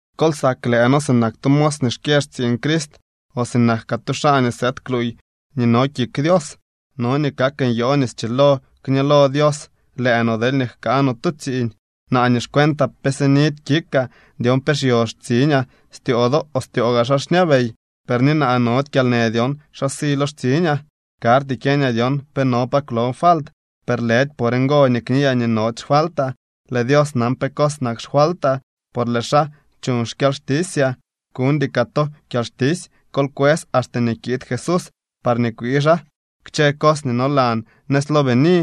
Kol sak lëë noo sinak tu mos nii xkyë xtsiiñ Crist, o sinak kaa tu xaa nii sëëd kluuy nii no kik Dios. No nii kak nyoo nii schilo kñëlo Dios lëë no deelñee jkaa no tu tsiiñ. Naa nii xcuentaa pe sinidy kikaa dyon pe xyo xtsiñaa styoo do o styoo gaa xaa xñabey. Per ni naa nody kyalnë dyon xa si lo xtsiñaa. Karty kyeñaa dyon pe no pa kwlon falt, per lëdy por ngo nii kniyaa nii nody xfaltaa. Lëë Dios nan pe cos nak xfaltaa, por lëë xaa chuñ xkyalxtisyaa. Kuñdy kaa to kyalxtisy. Kol kwës axte nii kiid Jesús parñee kwii xaa kchë cos nii nolan nëz lo bini.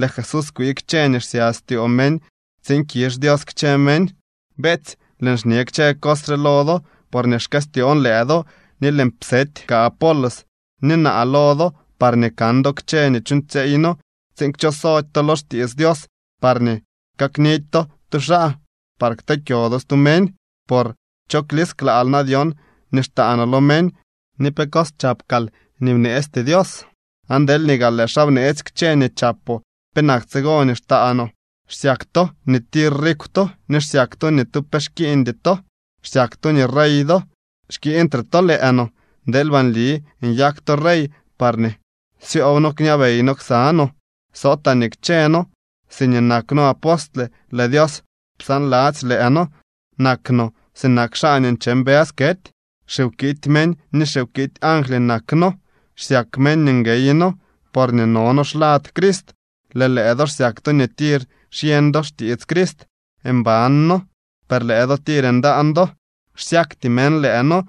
Lëë Jesús kwii kchë nii xsya styoo meñ tsiin kizh Dios kchë meñ. Beetsy, lëën xñe kchë cos re lo do porñee xkëstyoon lëë do. Ni lëën psety kaa Apolos ni naa lo do parñee kan do kchë nii chuuñtsyeey noo tsiin kchosody to lo xtiits Dios parñee kaknidy to tu xaa par kteekyo do stu meñ. Por ¿cho xlisklaal na dyon nii xtaa noo lo meñ, ni pe cos chap kaal nii bneesty Dios? Aan deelñee gaa lëë xaa bneetsy kchë nii chapoo, ¿penak tsigo nii xtaanoo? Xsyak to ni tir rikw to ni xsyak to nii ni tu pe xkiiñdy to. Xsyak to nii rey do. Xkiiñtre to lëë no. ¡Deelba nli nyak to rey parñee syoob noo kñabey no ksa no! Sootaa nii kchëë noo siñee nak noo apostle lëë Dios psaanladzy lëë noo. Nak no sinak xaa nii nche mbës kety. Xiwkity meñ ni xiwkity angly nak noo. Xsyak meñ nii nguey noo, porñee no noo xlad Crist. Lëë lëë do xsyak to nii tir xyeñ do xtiits Crist. Mban noo, per lëë do tir ndaan do. Xsyakty meñ lëë noo,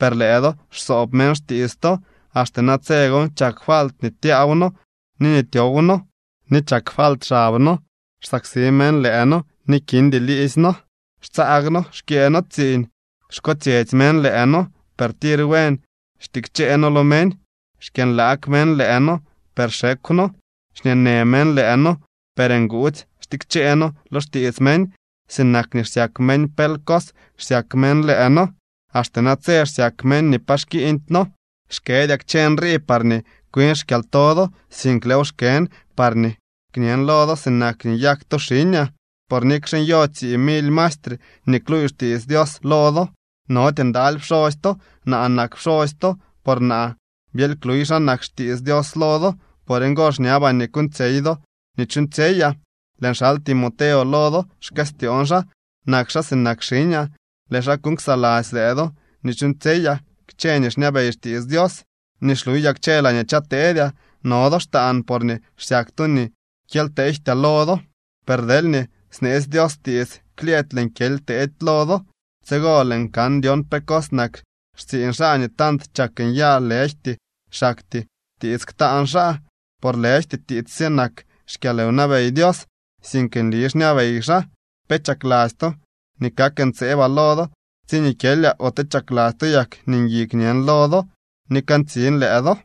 per lëë do xsoob meñ xtiits to. Axte natse gon chak falt nii tyaaw noo ni nii tyow noo, ni chak falt xab noo. Xsaksi meñ lëë noo ni kindy liidzy noo. Xtsaag noo xkyëë noo tsiiñ. Xkotsyetsy meñ lëë noo, per tiits buen xtikchee noo lo meñ. Xkyënlaag meñ lëë noo, per xekw noo. Xñeenë meñ lëë noo, per nguudzy xtikchee noo lo xtiits meñ. Sinak nii xsyak meñ pel cos xsyak meñ lëë noo. Axte natse xyak meñ nii pa xkiiñdy noo. Xkëdyaa kchë nrii parñee kwin xkyalto do, sink lëëw xkën parñee kñen lo do sinak nii nyak to xiñaa. Por nikxe nyo tsii mily maestre nii kluuy xtiits Dios lo do, nody ndaly pxosy to. Naa nak pxosy to, por naa byely kluuy xa nak xtiits Dios lo do. Por ngo xñabaa nii kuuñtsyey do nii chuuñtsyeyaa. Lëën xal Timoteo lo do. Xkëstyoon xaa. Nak xaa sinak xiñaa. Lëë xaa kuuñ ksaladzy lëë do nii chuuñtsyeyaa kchë nii xñabey xtiits Dios nii xluyaa kchë laañee chateedyaa. No do xtaan porñee xsyak to nii kyely teejtyaa lo do. Per deelñee sneetsy Dios tiits klyëëdy lëën kyely teedy lo do. Tsigo lëën kan dyon pe cos nak xtsiiñ xaa nii tant chak nyaa lëjty xaktyee tiits ktaan xaa. Por lëjty tiits sye nak xkyalwnabey Dios, sink nli xñabey xaa. ¿Pe chakladzy to nii kak ntseebaa lo do tsiñee kyelyaa ote chakladzy to yak nii ngui kñen lo do ni kantsin lëë do?